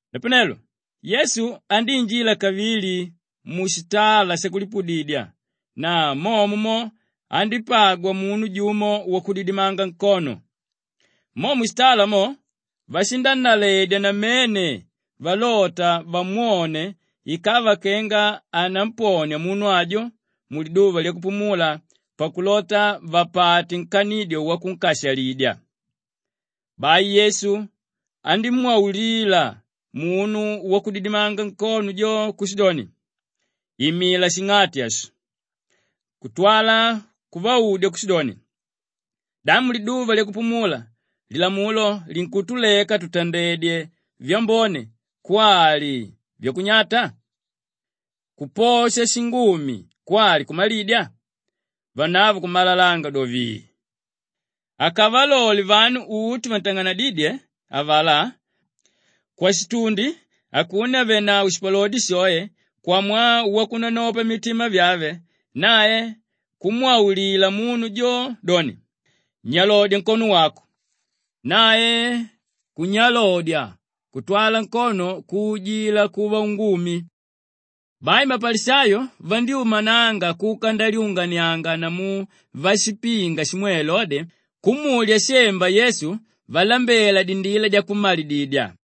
Napanelo Yesu andíinjila kavili mushitala shakulipudidya na momo mo andípagwa munu jumo wakudidimanga nkono. Mo mushitala mo, vashinannaledya namene valota vamwone ikava kenga anamponia munu ajo muliduva lyakupumula pakulota vapate nkanidyo wakunkashalidya. Bai Yesu andímwaulila munu wakudidimanga nkono jo kushidoni, “Imila shing'ati ashi!” Kutwala kuvaudya kushidoni, “Da muliduva lyakupumula lilamulo linkutuleka tutandedye vyambone kwali vyakunyata? Kuposha shingumi kwali kumalidya?” Vanavo kumalalanga do, vii! Akavalole vanu uti vantang'anadídye avalá kwashitundi akuno àvenavo shipalodi shoe kwamwaa wakunanopa mitima vyave, nae kumwaulila munu jo doni, “Nyalodya nkono wako!” Nae kunyalodya kutwala nkono kuujila kuva ungumi. Bai mapalishayo vandyúmananga kuka ndalyunganianga namu vashipinga shimwe Elode kumulya shemba Yesu valambela dindila dyakummalididya.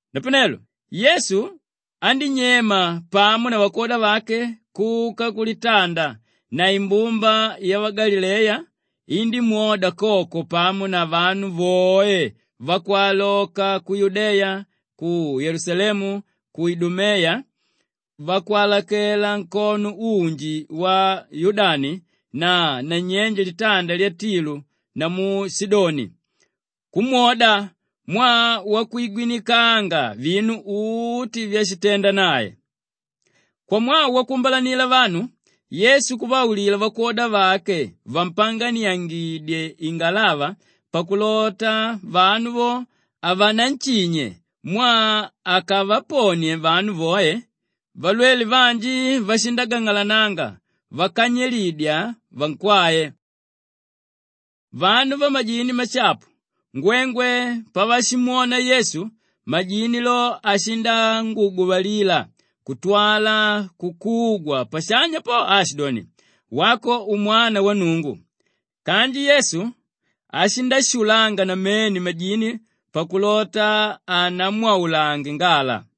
Napanelo Yesu andínyema pamo na vakwoda vake kuka kulitanda na imbumba yavagalileya indímwoda koko pamo na vanu voe vakwaloka ku Yudeya, ku Yelusalemu, ku Idumeya, vakwalakela nkono unji wa Yudani na nanyenje likaja lya Tilu namu Shidoni; kumwoda mwaa wakwigwinikanga vinu uti vyashitenda nae. Kwamwaa wakuumbalanila vanu, Yesu kuvaulila vakwoda vake vampanganiangidye ingalava pakulota vanu vo havananshinye mwaa akavaponie vanu voe valwele vanji vashindagang'alananga vakanyilidya avakwae. Vanu vamajini mashapu ngwengwe pavashimwona Yesu, majini lo ashindanguguvalila kutwala kukugwa pashanya po aashidoni, “Wako Umwana wa Nnungu.” Kanji Yesu ashindashulanga namene majini pakulota hanamwaulange ngala.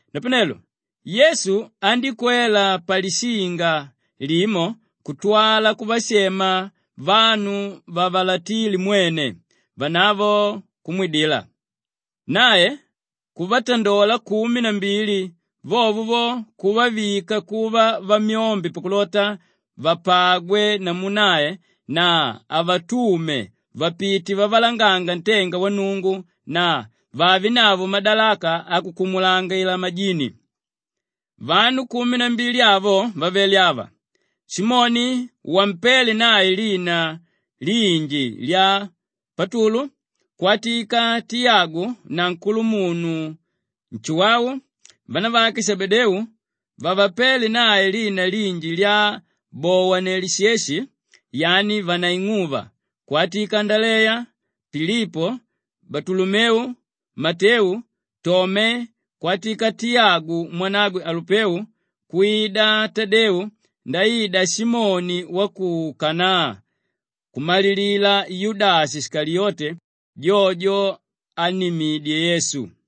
Napanelo Yesu andíkwela palishinga limo kutwala kuvashema vanu vavalatile mwene, vanavo kumwidila. Nae kuvatandola kumi na mbili vovo vo kuvavika kuva vamyombe pakulota vapagwe namu nae na avatume vapite vavalanganga ntenga wa Nnungu na vavenavo madalaka akukumulangila majini. Vanu kumi na mbili avo vavele ava: Simoni wampéle nae lina linji lya Patulu kwatika Tiyagu na nkulumunu Nshuwau vanavake Shebedeu vavapéle nae lina linji lya Bowanelisheshi yani vanaing'uva kwida Andaleya, Pilipo, Balutolomeu, Mateu, Tome, kwatika Tiyagu mwanagwe Alupeu kwida Tadeu ndaida Simoni wa ku Kanaa kumalilila Yudashi Shikaliyote jojo ánnimidye Yesu.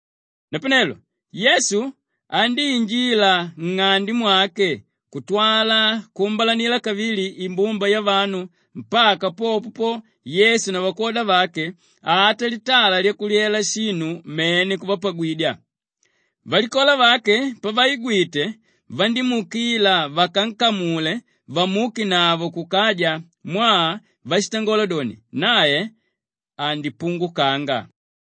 Napanelo Yesu andíinjila nng'ande mwake kutwala kuumbalanila kavili imbumba yavanu mpaka popo Yesu na vakwoda vake ata litala lyakulyela shinu mene kuvapagwidya. Valikola vake pavaigwite vandímuukila vakankamule vamuukenavo kukaja mwaa vashitangola doni, “Nae andipungukanga.”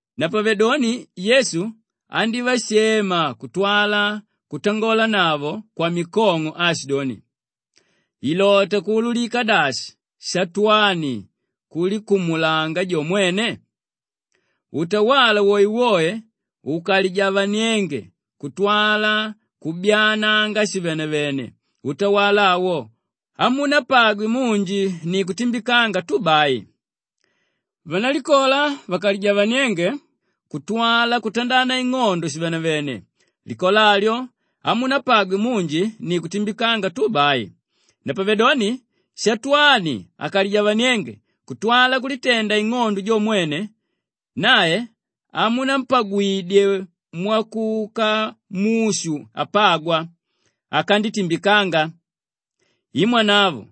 Napavedoni Yesu andívashema kutwala kutangonavo kwamikong'o aashidoni, “Ilota kuululika dashi Shatwani kulikumulanga jo mwene? Utawala woewoe ukalijavanienge kutwala kubyaananga shivenevene, utawala awo hamunapagwe munji ni kutimbikanga tu bai. Vanalikola vakalijavanienge kutwala kutandana ing'ondo shivenevene, likola alyo hamunapagwe munji ni kutimbikanga tu bai. Napavedoni Shatwani akalijavanienge kutwala kulitenda ing'ondo jo mwene, nae hamunampagwidye mwakuka mushu apagwa, akanditimbikanga. I mwanavo!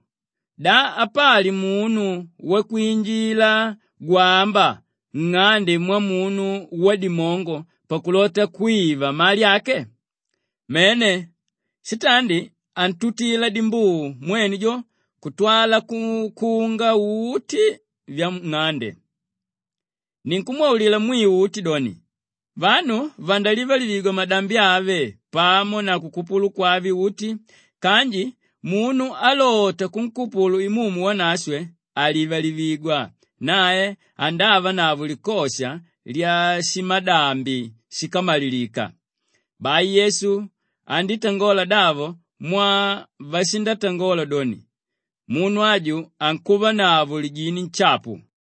Da apali munu wakwinjila gwamba nng'ande mwamunu wadimongo pakulota kwiva mali ake? Mene, shitandi antuntila dimbuu mwene jo kutwala kukunga uti vyanng'ande. Ninkumwaulila mwiu uti doni, vanu vandalivalivigwa madambi ave pamo na kukupulu kwave uti kanji munu álota kunkupulu Imumu Wanashwe halivalivigwa, nae andavanavo likosha lyashimadambi shíkamalilika.” Bai Yesu andítangola davo mwaa vashitangola doni, “Munu aju ankuvanavo lijini nshapu.”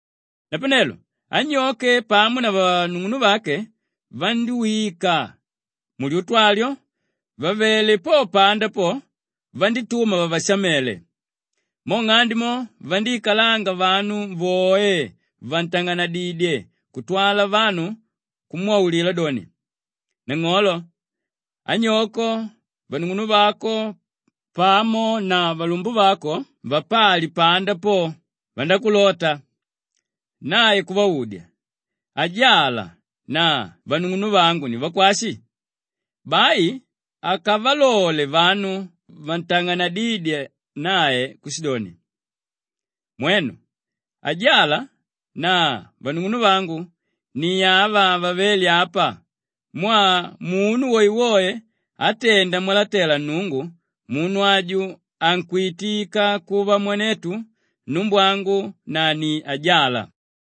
Napanelo anyoke pamo na vanung'unuvake vandíwika mulyutu alyo; vavele po panda po vandítuma vavashamele. Mo nng'ande mo, vandíikalanga vanu voe vantang'anedidye kutwala vanu kumwaulila doni, “Nang'olo, anyoko, vanung'unuvako pamo na valumbuvako vapali panda po, vandákulota.” Nae kuvaudya, “Ajala na vanung'unuvangu ni vakwashi?” Bai akavalole vanu vantang'anedídye nae kushidoni, “Mwenu, ajala na vanung'unuvangu ni ava vavéle apa mwaa munu woewoe átenda mwalatela Nnungu, munu aju ankwitika kuva mwanetu, numbwangu na ni ajala.”